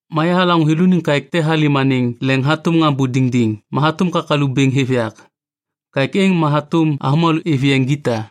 Ma yahalaŋô thêlôniŋ kaêk halêm anêŋ leŋ hatôm ŋambô diŋdiŋ ma hatôm kakalu bêŋ hêv yak. Kaêk êŋ ma hatôm avômalô êv yeŋ gita.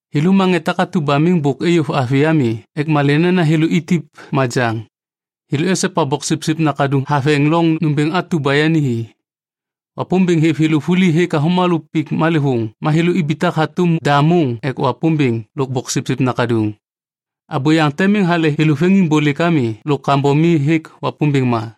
Thêlô ma ŋê takatu ba miŋ bôk eyov avi ami ek malê nena thêlô itip majaŋ. Thêlô esopa Boksipsip Nakaduŋ haveŋ loŋ nômbêŋ atu ba yani hi. Wapômbêŋ hêv thêlô vuli hêk avômalô pik malêvôŋ ma thêlô ibitak hatôm da môŋ ek Wapômbêŋ lôk Boksipsip Nakaduŋ. Abôyaŋ te miŋ hale thêlô veŋiŋbôlêk ami lôk kambom mi hêk Wapômbêŋ ma.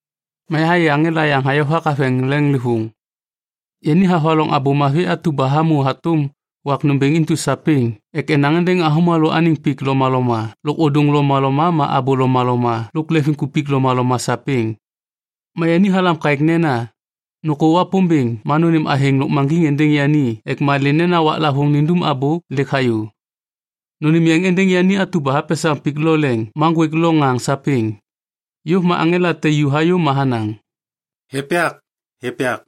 Ma yahayê aŋela yaŋ hayovak haveŋ leŋlêvôŋ. Yani havaloŋ Abô Mavi atu ba hamô hatôm wak nômbêŋ intu sapêŋ ek enaŋ êndêŋ avômalô anêŋ pik lomaloma lôk ôdôŋ lomaloma ma abô lomaloma lôk leŋviŋkupik lomaloma sapêŋ. Ma yani halam kaêk nena, “Nôkô Wapômbêŋ ma nônêm athêŋ lôkmaŋgiŋ êndêŋ yani ek malê nena waklavôŋ nindum abô lêk hayô. Nônêm yeŋ êndêŋ yani atu ba hapesaŋ pik lo leŋ ma ŋgwêk lo ŋaŋ sapêŋ.” Yôv ma aŋela te ju hayô ma hanaŋ, “Hêv yak, hêv yak.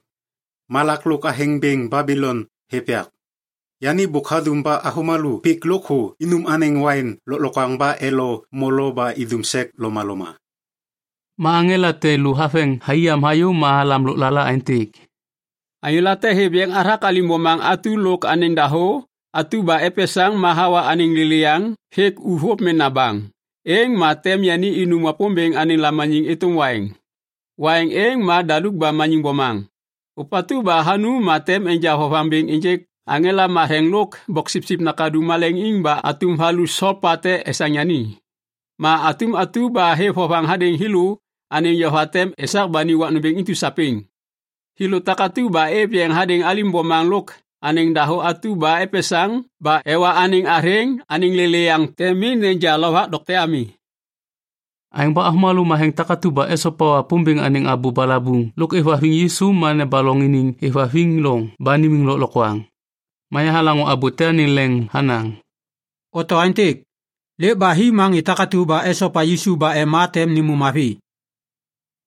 Malak lôk athêŋ bêŋ Babilon hêv yak. Yani bôk hadum ba avômalô pik lôkthô inum anêŋ waiŋ lôklokwaŋ ba elo molo ba idum sek lomaloma.” Ma aŋela te lô haveŋ thai yam hayô ma halam lôklala aêntêk, “Anyô late hêv yeŋ hathak alim bomaŋ atu lôk anêŋ dahô atu ba epesaŋ ma hawa anêŋ lêlêyaŋ hêk uvôv mena baŋ, êŋ ma tem yani inum Wapômbêŋ anêŋ lamaniŋ êtôm waiŋ. Waiŋ êŋ ma daluk ba maniŋ bomaŋ. Ôpatu ba hanum ma tem enja vovaŋ bêŋ ênjêk aŋela lôk Boksipsip Nakaduŋ maleŋiŋ ba atum valu solpa tem esaŋ yani. Ma atum atu ba hêv vovaŋ hadêŋ thêlô anêŋ yova tem esak ba ni wak nômbêŋ intu sapêŋ. Thêlô takatu ba êv yeŋ hadêŋ alim bomaŋ lôk anêŋ dahô atu ba epesaŋ ba ewa anêŋ athêŋ anêŋ lêlêyaŋ tem miŋ neja lovak dokte ami.” Aêŋ ba avômalô matheŋ takatu ba esopa Wapômbêŋ anêŋ abô balabuŋ lôk êvhaviŋ Yisu ma nebaloŋ iniŋ êvhaviŋ loŋ ba nimiŋ lôklokwaŋ. Ma yahalaŋô abô te anêŋ leŋ hanaŋ, “Oto aêntêk, ‘Lêk ba hi ma ŋê takatu ba esopa Yisu ba ema tem nêmô mavi.’”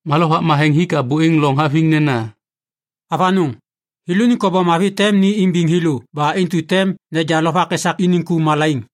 Ma Lovak Matheŋ hik abô êŋ loŋ haviŋ nena, “Avanôŋ, thêlôniŋ kobom mavi tem ni imbiŋ thêlô ba intu tem neja lovak esak iniŋ ku malaiŋ.”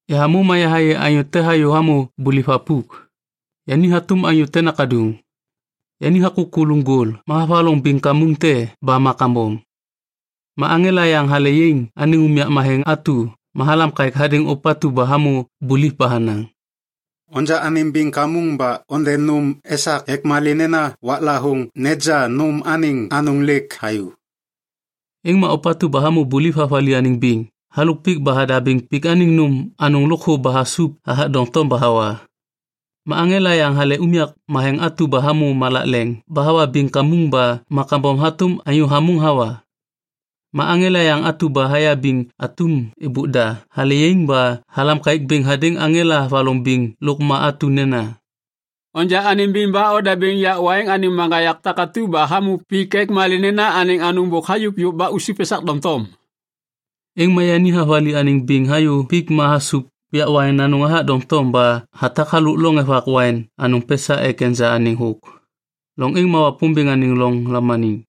Yahamô ma yahayê anyô te hayô hamô buliv thapuk. Yani hatôm anyô te nakaduŋ. Yani hakôk kuluŋ gol ma havaloŋ biŋ kamuŋ te ba ma kambom. Ma aŋela yaŋ hale yaiŋ anêŋ unyak matheŋ atu ma halam kaêk hadêŋ ôpatu ba hamô buliv ba hanaŋ, “Onja anêm biŋ kamuŋ ba onde nôm esak ek malê nena waklavôŋ neja nôm anêŋ anôŋ lêk hayô.” Êŋ ma ôpatu ba hamô buliv havali anêŋ biŋ halôk pik ba hadabêŋ pik anêŋ nôm anôŋ lôkthô ba hasup hathak doŋtom ba hawa. Ma aŋela yaŋ hale unyak matheŋ atu ba hamô malak leŋ ba hawa biŋ kamuŋ ba ma kambom hatôm anyô hamôŋ hawa. Ma aŋela yaŋ atu ba hayabiŋ atum êbôk da hale yaiŋ ba halam kaêk bêŋ hadêŋ aŋela havaloŋ biŋ lôk ma atu nena, “Onja anêm biŋ ba odabêŋ yak waiŋ anêŋ maŋgayak takatu ba hamô pik ek malê nena anêŋ anôŋ bôk hayôk yôv ba usup esak doŋtom.” Êŋ ma yani havali anêŋ biŋ hayô pik ma hasup yak waiŋ anôŋ hathak doŋtom ba hatak halôk loŋ evak waiŋ anôŋ pesa ek neja anêŋ thôk. Loŋ êŋ ma Wapômbêŋ anêŋ loŋ lamaniŋ.